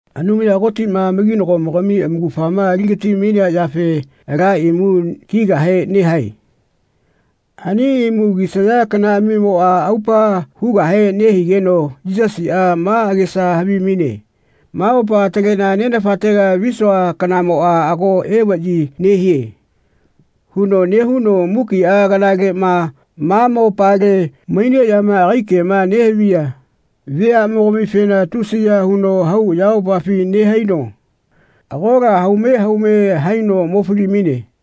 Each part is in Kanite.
Anumaya Kotiꞌma amakinagomogami amaugafama ali-gati-mainea yafe ala imu kigahe nehae. Ani imu kisaya kanaꞌamimoꞌa aupa hugahe nehigeno Yisasiꞌa ma agesa havimaine “Ma mopa ataleꞌna Nenafatega visua kanamoꞌa ago evaꞌyi nehie.” huno nehuno mukiꞌa kanaleꞌma ma mopale maineꞌyama agai kema nehaviya veaꞌmogamifena tusiya huno hau ayamopafi nehaino agola haume haume haino mo fali-maine.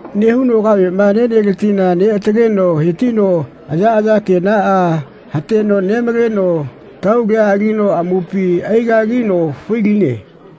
Nehuno kaveꞌma neneletila neꞌataleno he-tino ayaꞌaya kenaꞌa hateno nemaleno taulia alino amupi ai-gagino fai-line.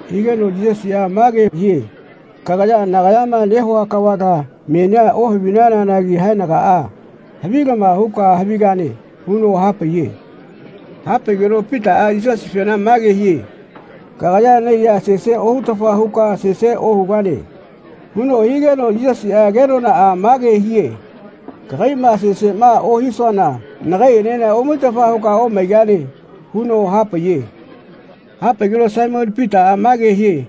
Higeno Yisasiꞌa mage hie “Kagaya nagayama nehua kavala menia ohavinanagi haenagaꞌa havilama huka havigane.” huno hapaiye. Ha-paigeno Pitaꞌa Yisasifena mage hie “Kagaya naiya sese ohutafa huka sese ohugane.” huno higeno Yisasiꞌa kenonaꞌa mage hie “Kaiyama seseꞌma ohisuana nagaiꞌenena omaitafa huka omaigane.” huno hapaiye. Hapaigeno Saimoni Pitaꞌa mage hie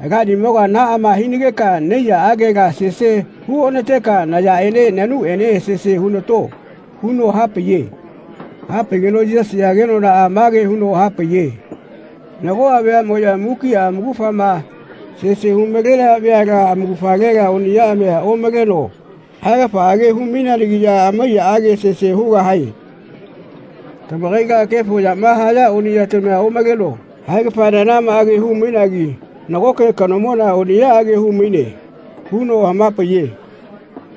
“Alaniꞌamoga naꞌama hinageka naiyaꞌagela sese hu ona-teka nayaꞌene nanuꞌene sese hu-nato.” huno hapaiye. Ha-paigeno Yisasiꞌa kenonaꞌa mage huno hapaiye “Nagoꞌa veaꞌmoꞌya mukiꞌa amaugafama sese hu-malenaya veala amaugafalela oniꞌyaꞌamia omaleno haigafaꞌage hamau-maineanagiꞌya amaiyaꞌage sese hugahae. Tamakaila kefo yama haya oniꞌyatamia omaleno haigafananamaꞌage hu-mainagi nagoke kanomona oniꞌyaꞌage hau-maine.” huno hama-paiye.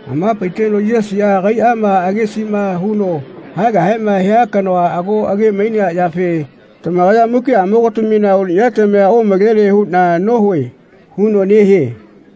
Hama-paiteno Yisasiꞌa agaiꞌma agesiꞌma huno haegahema hia kanoa ago age-mainea yafe “Tamakaya mukiꞌamogatamina oniꞌyatamia omalene huꞌna nohue.” huno nehie.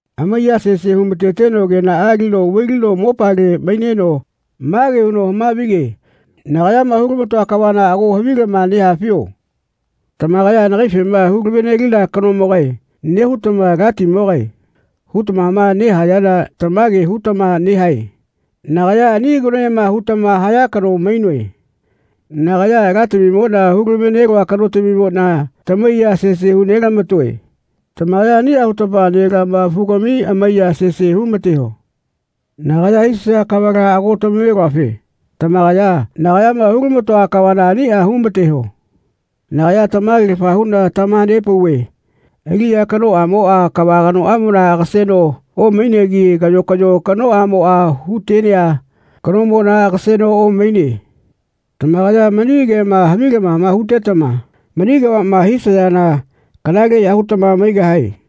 Amaiya sese hu-ma-teteno kenaꞌa alino vai-lino mopale maineno mage huno hama-vige “Nagayama hu-lama-toa kavala ago havilama nehafio? Tamakaya nagaifema ‘Hulave-nelina kanomogae.’ nehutama ‘Alatimogae.’ hutamama nehayana tamage hutama nehae. Nagaya ani kanoema hutama haya kano mainoe. Nagaya Alatamimoꞌna hu-lama-ve-neloa kanotamimoꞌna tamaiya sese hu-nelama-toe. Tamakaya aniꞌa hutama nelamafugami amaiya sese hu-ma-teho. Nagaya hisaya kavala ago tamave-neluafe tamakaya nagayama hu-lama-toa kavala aniꞌa hu-ma-teho. Nagaya tamagelafa huꞌna tamaha-nepauve aliꞌya kanoꞌamoꞌa kava kanoꞌamona agaseno omainegi kayo kayo kanoꞌamoꞌa hu-tenea kanomona agaseno omaine. Tamakaya mani kema havilamama hutetama mani kavaꞌma hisayana kanaleꞌya hutama maigahae.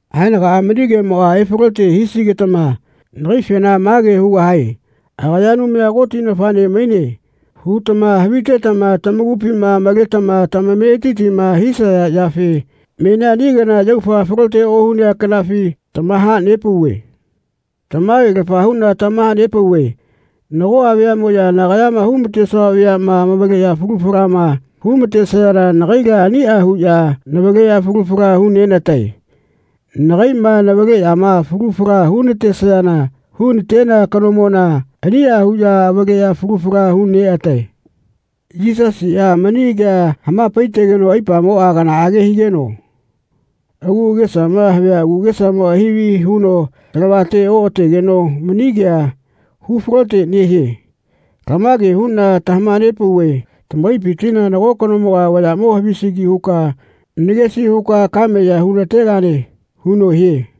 Haenagaꞌa mani kemoꞌma efalote hisigetama nagaifena mage hugahae ‘Agaya Anumaya Koti nafaꞌne maine.’ hutama havitetama tamakupima maletama tamametitima hisaya yafe menia ani kana yaufa falote ohunea kanafi tamaha-nepauve. Tamage-lafa huꞌna tamaha-nepauve nagoꞌa veaꞌmoꞌya nagayama hu-ma-tesua veaꞌma amavaleꞌya falu falama hu-ma-tesayana nagaila aniꞌa huꞌya navaleꞌya falu fala hu-nena-tae. Nagaiꞌma navaleꞌyama falu fala hu-natesayana hu-na-tenea kanomona aniꞌa huꞌya avaleꞌya falu fala hu-neꞌatae.” Yisasiꞌa mani kea hama-paitegeno aipamoꞌa kanaꞌage higeno agu agesama havia agesamoꞌa hivi huno talavate oꞌategeno mani kea hu-falote nehie “Lamage huꞌna tamaha-nepauve tamakaipitila nago kanomoga vayaꞌmo havisigi huka nagesi huka kame ya hu-na-tegane.” huno hie.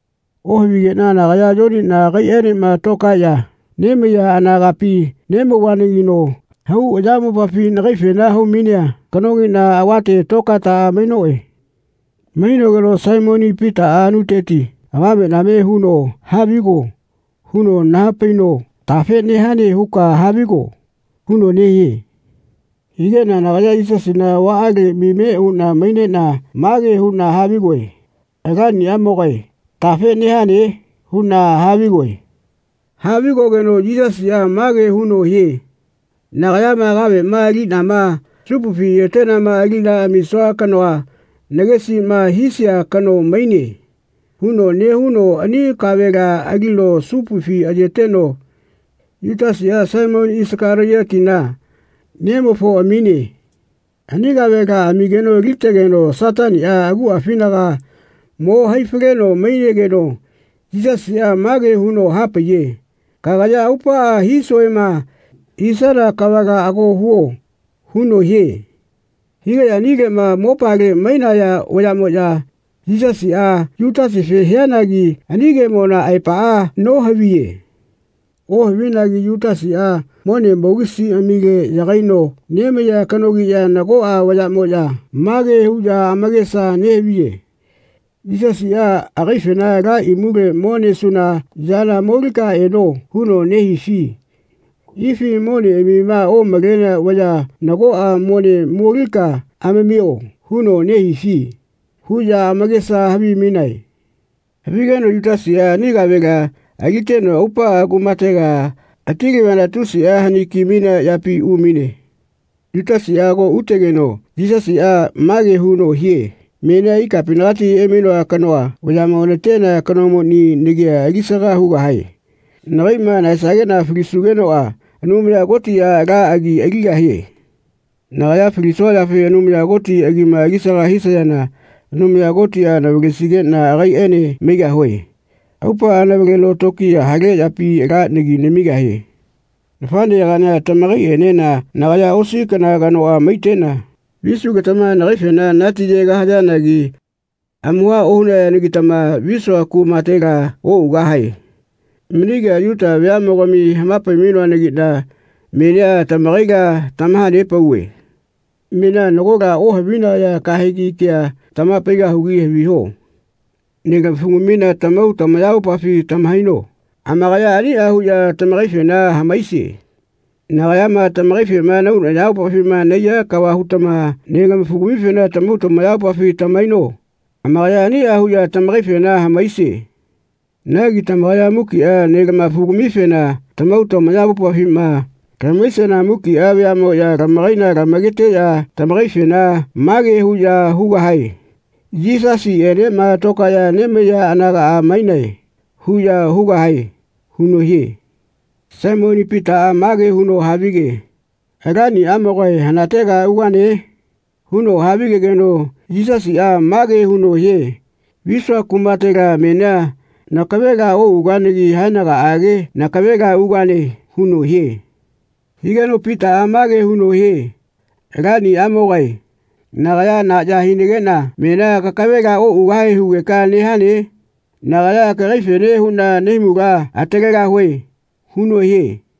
Ohavigeꞌna nagaya Yoniꞌna agaiꞌaenema tokaeꞌya nemaiya anagapi nemauvanagino hau ayamopafi nagaifena hau-mainea kanogiꞌna avate tokaetaꞌa mainoꞌe. Mainogeno Saimoni Pitaꞌa anuteti avameꞌname huno “Havigo.” huno naha-paino “Tafe nehane huka havigo.” huno nehie. Higeꞌna nagaya Yisasina avaꞌale mime uꞌna maineꞌna mage huꞌna havigoe “Alaniꞌamogae tafe nehane?” huꞌna havigoe. Havigogeno Yisasiꞌa mage huno hie “Nagayama kaveꞌma aliꞌnama supufi ayeteꞌnama aliꞌna amisua kanoa nagesiꞌma hisia kano maine.” huno nehuno ani kavela alino supufi ayeteno Yutasiꞌa, Saimoni Isakaliotina nemofo amine. Ani kavela amigeno alitegeno Sataniꞌa aguꞌafinaga mo hai-faleno mainegeno Yisasiꞌa mage huno hapaiye “Kagaya aupaꞌa hisuema hisana kavala ago huo.” huno hie. Higeꞌya anileꞌma mopale mainaya vayaꞌmoꞌya Yisasiꞌa Yutasife hianagi ani kemona aepaꞌa nohaviye. Ohavinagi Yutasiꞌa mone pokisiꞌamile yagaino nemaiya kanogiꞌya nagoꞌa vayaꞌmoꞌya mage huꞌya amakesa nehaviye “Yisasiꞌa agaifena ‘Ala imule mo nesuna yana molika eno.’ huno nehifi ifi ‘Moneꞌamima omalenea vaya nagoꞌa mone molika amamio.’ huno nehifi?” huꞌya amakesa havimainae. Havigeno Yutasiꞌa ani kavela aliteno aupaꞌa kumatega hati-laviana tusiꞌa hani ki-mainea yapi umaine. Yutasiꞌa ago utegeno Yisasiꞌa mage huno hie “Menia ikapinagati emainoa kanoa vayaꞌmo natenea kanomoni nagia ali-saga hugahae. Nagaiꞌma nahaesageꞌna falisugenoꞌa Anumaya Kotiꞌa ala agi aligahie. Nagaya falisua yafe Anumaya Koti agima ali-saga hisayana Anumaya Kotiꞌa navalesigeꞌna agaiꞌene maigahue. Aupaꞌa navaleno tokiya hale yapi ala nagi namigahie. Nafaꞌneyagaꞌnia tamakaiꞌenena nagaya osi kana kanoꞌa maiteꞌna visugetama nagaifena natiyegahayanagi amuha ohunayanagitama visua kumatela oꞌugahae. Mani kea Yuta veaꞌmogami hama-pai-mainoanagiꞌna menia tamakaila tamaha-nepauve. Menia nagola ohavinaya kahegi kea tamaha-paigahugi haviho. Nelama-fugamifena tamahau tamayamopafi tamahaino. Amakaya aniꞌa huꞌya tamakaifena hamaisie. Nagayama tamakaifema nahau nayamopafima nahaiya kava hutama nelama-fugamifena tamahau tamayamopafi tamahaino. Amakaya aniꞌa huꞌya tamakaifena hamaisie. Nagi tamakaya mukiꞌa nelama-fugamifena tamahau tamayamopafima lamahaisiana muki veaꞌmoꞌya tamakaila lamaketeꞌya tamakaifena mage huꞌya hugahae ‘Yisasiꞌenema tokaeꞌya nemaiya anaga mainae.’ huꞌya hugahae.” huno hie. Saimoni Pitaꞌa mage huno havige “Alaniꞌamogae hanatega ugane?” huno havigegeno Yisasiꞌa mage huno hie “Visua kumatela menia nakavela oꞌuganagi haenagaꞌage nakavela ugane.” huno hie. Higeno Pitaꞌa mage huno hie “Alaniꞌamogae nagaya na ya hinageꞌna menia kakavela oꞌugahe hugeka nehane? Nagaya kagaifene huꞌna nahaimula atalegahue.” huno hie.